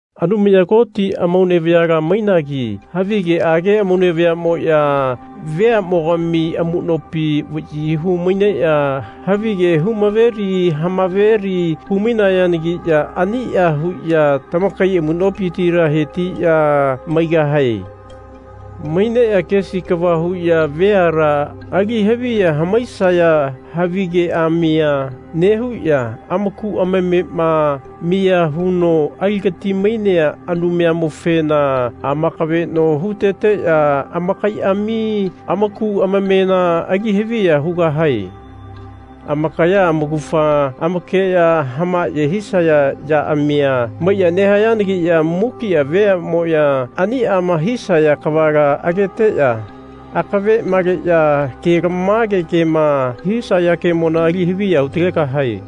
Anumaya Koti amaune vayala mainagi havigeage amaune vayamoya veamogami amunopi vayi hu-maineya havigea hu-maveli ha-maveli hu-mainayanagiya ania huya tamakai amunopitila hetiya maigahae. Maineya kesi kava huya veala ali haviya hamaisaya havigeamia nehuya amaku amamema miya huno aligati-mainea Anumayamofena amakaveno huteteya amakaiami amaku amamena ali haviya hugahae. Amakaya amaugafa amakeya hamaye hisaya yaamia maiya nehayanagiya mukia veamoya aniama hisaya kavala ageteya akave maleya kelamage kema hisaya kemona ali haviya hu-talegahae.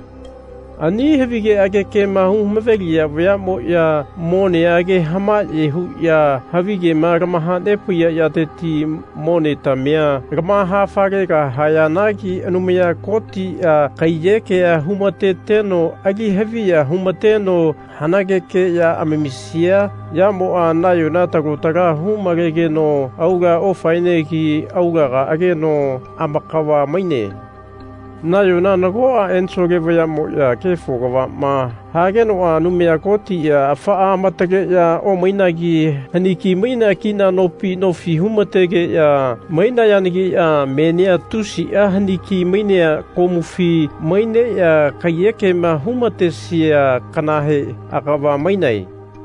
Ani havigeage kema hu-maveliya vayamoya monea age hamaye huya havigema lamahanepaiya yateti monetamia lamaha-falegahayanagi Anumaya Kotia kaiyekea hu-mateteno ali haviya hu-mateno hanageke ya amamisia yamoa nayona talo tala hu-malegeno aula ofaenegi aulaga ageno amakava-maine. Nayona nagoa ensole vayamoya kefo kavama hagenoa Anumaya Kotia afaa amataleya omainagi haniki-mainea kina nopi nofi hu-mategeya mainayanagiya menia tusia haniki-mainea komufi maineya kaiyekema hu-matesia kanahe agava-mainae.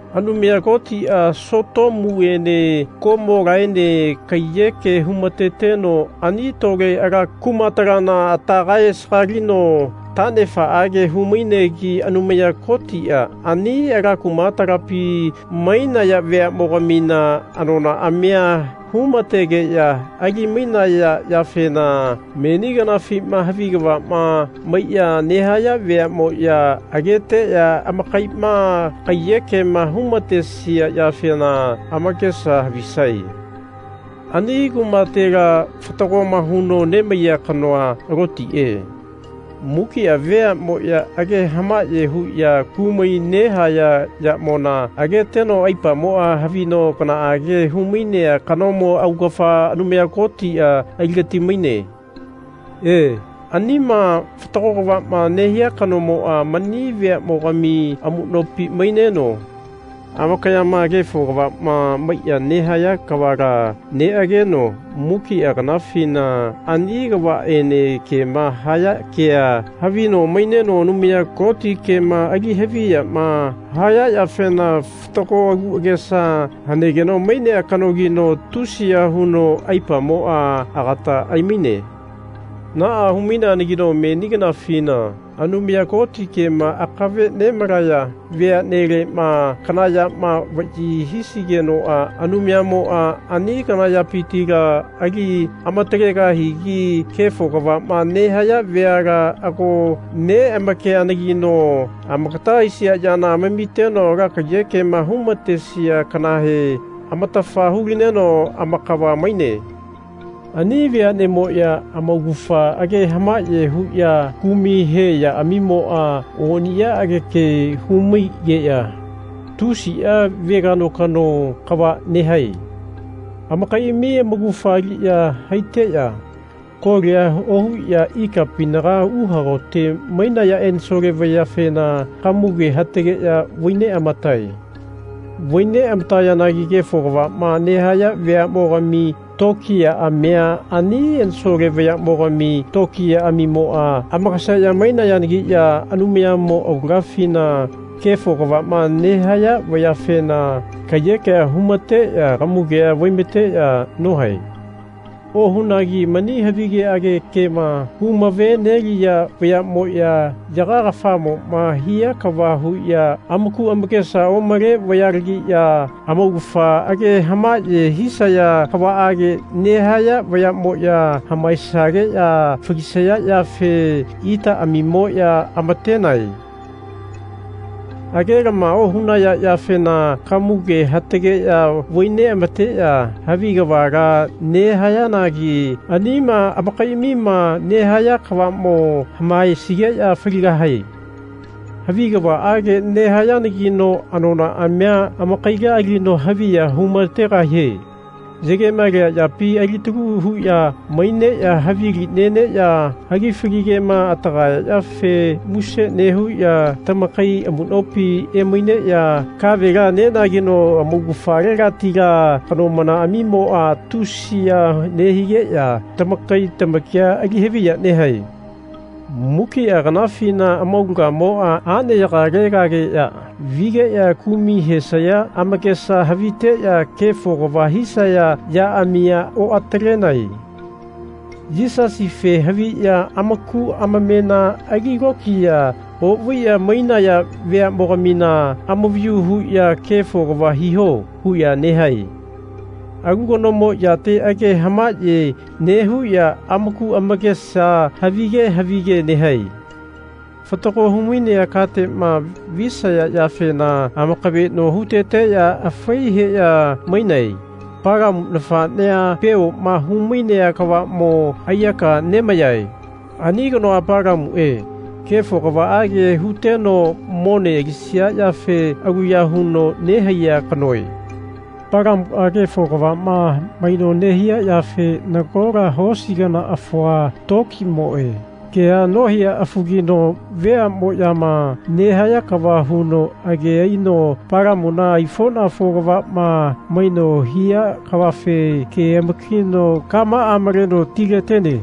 Anumaya Kotia Sotomuene Komolaene kaiyeke hu-mateteno ani tole ala kumatalana ata kae-sagaligeno tanefaage hu-mainegi Anumaya Kotia ani ala kumatalapi mainaya veamogamina anonaamia humategeya ali-mainaya yafena meni kanafima havi kavama maiya nehaya veamoya ageteya amakaima kaiyekema humatesia yafena amakesa havisae. Ani kumatela fatagoma huno nemaiya kanoa, Lotie, mukia veamoya age hamaye huya kumai nehaya yamona ageteno aipamoa havino kanaage humainea kanomo augafa Anumaya Kotia aligati-maine. E, anima fatago kavama nehia kanomoa mani veamogami amunopi maineno amakayama kefo kavama maiya nehaya kavala neageno mukia kanafina ani kavaene kema haya kea havino maineno Anumaya Koti kema ali haviyama haya yafena fatago agu agesa hanegeno mainea kanogino tusiya huno aipamoa agata aimaine. Naa hu-maineanagino meni kanafina Anumaya Koti kema akave nemalaya veanelema kana yama vayi hisigenoa Anumayamoa ani kana yapitila ali amatalegahigi kefo kavama nehaya veala ago neamakeanagino amakata aisia yana amamiteno ala kaiyekema hu-matesia kanahe amatafa hu-lineno amakava maine. Ani veanemoya amaugafa age hamaye huya kumai he yaamimoa oniyaage hamaigeya tusia veganokano kava nehae. Amakaiami amaugafa aliya haiteya kolia ohuya ikapinaga uhagote mainaya ensole vayafena kamuge hatageya vai neamatae. Vai neamatayanagi kefo kavama nehaya veamogami tokiyaamia ani ensole vayamogami tokiyaamimoa amakaseya mainayanagiya Anumayamo aulagafina kefo kavama nehaya vayafena kaiyekea hu-mateya kamugea vai-mateya nohae. Ohunagi mani havigeage kema hu-mave-neliya vayamoya yaga kafamoma hia kava huya amaku amakesa omale vayalagiya amaugafa age hamaye hisaya kavaage nehaya vayamoya hamaesageya falisaya yafe itaamimoya amatenae. Agelama ohunaya yafena kamuge hatageya vai neamateya havi kavala nehayanagi anima amakaiami nehaya kavamo hamaesigeya faligahae. Havi kavaage nehayanagino anonaamia amakaila alino haviya hu-mategahie. Yagema lea yapi alitalu huya maineya havili neneya hagifali kema hatagaya yafe muse nehuya tamakai amunopi emaineya kavela nenageno amaugafalegatila kanomanaamimoa tusi ya nehigeya tamakai tamakia ali haviya nehae. Mukia kanafina amaulagamoa aneyagalegageya vigeya kumai hesaya amakesa haviteya kefo kava hisaya yaamia oatalenae. Yisasife haviya amaku amamena ali lokiya ovaiya mainaya veamogamina amavayu huya Kefo kava hiho. huya nehae. Alu kanomo yate age hamaye nehuya amaku amakesa havige havige nehae. Fatago hu-mainea katema visaya yafena amakaveno huteteya afai heya mainae. Palamu nafanea Peoma humainea kavamo aiyaka nemayae. Ani kanoa Palamue kefo kavaage huteno mone alisia yafe aluya huno nehaiya kanoe. Palamua kefo kavama maino nehia yafe nagola hosi kana afua, tokimoe, kea nohia afugino veamoyama nehaya kava huno age aino Palamuna aifonafo kavama maino hia kavafe ke-amakino kamaa maleno tiletene.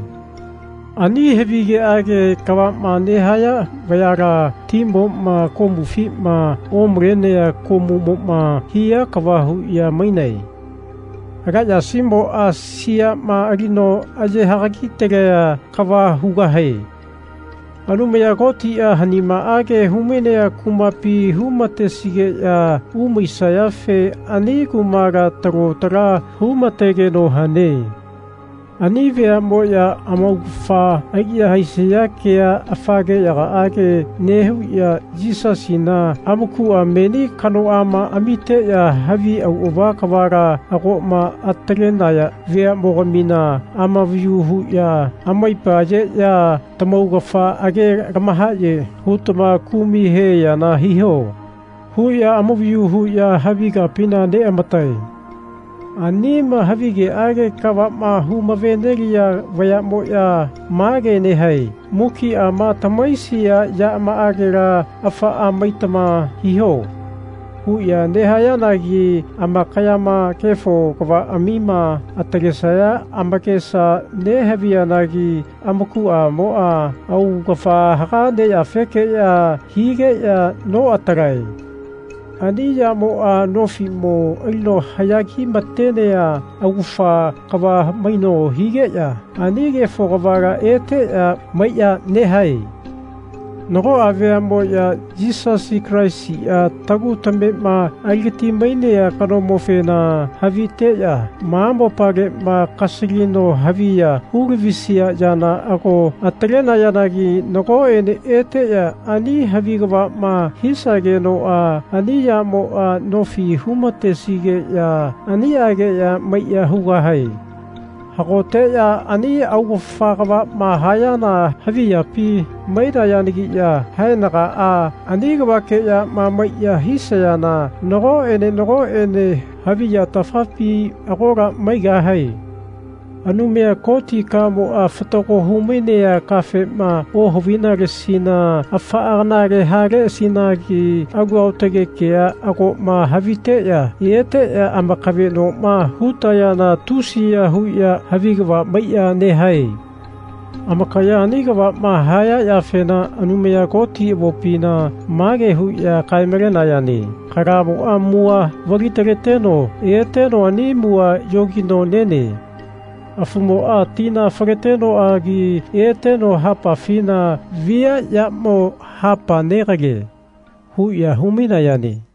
Ani havigeage kavama nehaya vayala timoma komufima omalenea komumoma hia kava huya mainae. Ala yasimoa siama alino aye hagagi-talea kava hugahae. Anumaya Kotia hanimaage humainea kumapi hu-matesigeya umaisayafe ani kumala talo tala hu-mategeno hane. Ani veamoya amaugafa aliya haisaya kea afa keyagaage nehuya Yisasina amakua meni kanoama amiteya havi auava kavala agoma atalenaya veamogamina amavayu huya amaipa ayeya Tamaugafa age lamahaye hutama kumai he yana hiho. huya amavayu huya havi kapina neamatae. Anima havigeage kavama humave-neliya vayamoya mage nehae Mukiama tamahaisia yamaagela afaa maitama hiho. huya nehayanagi amakayama kefo kavaamia atalesaya amakesa nehaviyanagi amakuamoa augafa haga neyafekeya higeya noatalae. Ani yamoa nofimo alino haya ki-matenea augafa kava maino higeya ani kefo kavala eteya maiya nehae. Nagoa veamoya Yisasi Kalaisia tagu tamema aligati-mainea kanomofena haviteya ma mopalema kasalino haviya hulavisia yana ago atalenayanagi nagoene eteya ani havi kavama hisagenoa ani yamoa nofi hu-matesigeya aniageya maiya hugahae. Hagoteya ani augafa kavama hayana havi yapi mainayanagiya haenagaa ani kavakeyama maiya hisayana nagoene nagoene havi yatafapi agola maigahae. Anumaya Koti kamoa fatago humainea kafema ohavinaleasina afaa kanale haleasinagi alu aotage kea agoma haviteya eteya amakavenoma hutayana tusiya huya havi kava maiya nehae. Amakaya ani kavama haya yafena Anumaya Koti avopina mage huya kae-malenayane Kalamoa mua vali-taleteno eteno ani mua yogino nene. Afumoa tina faletenoagi eteno hapafina viayamo hapa negalie. huya hu-mainayane.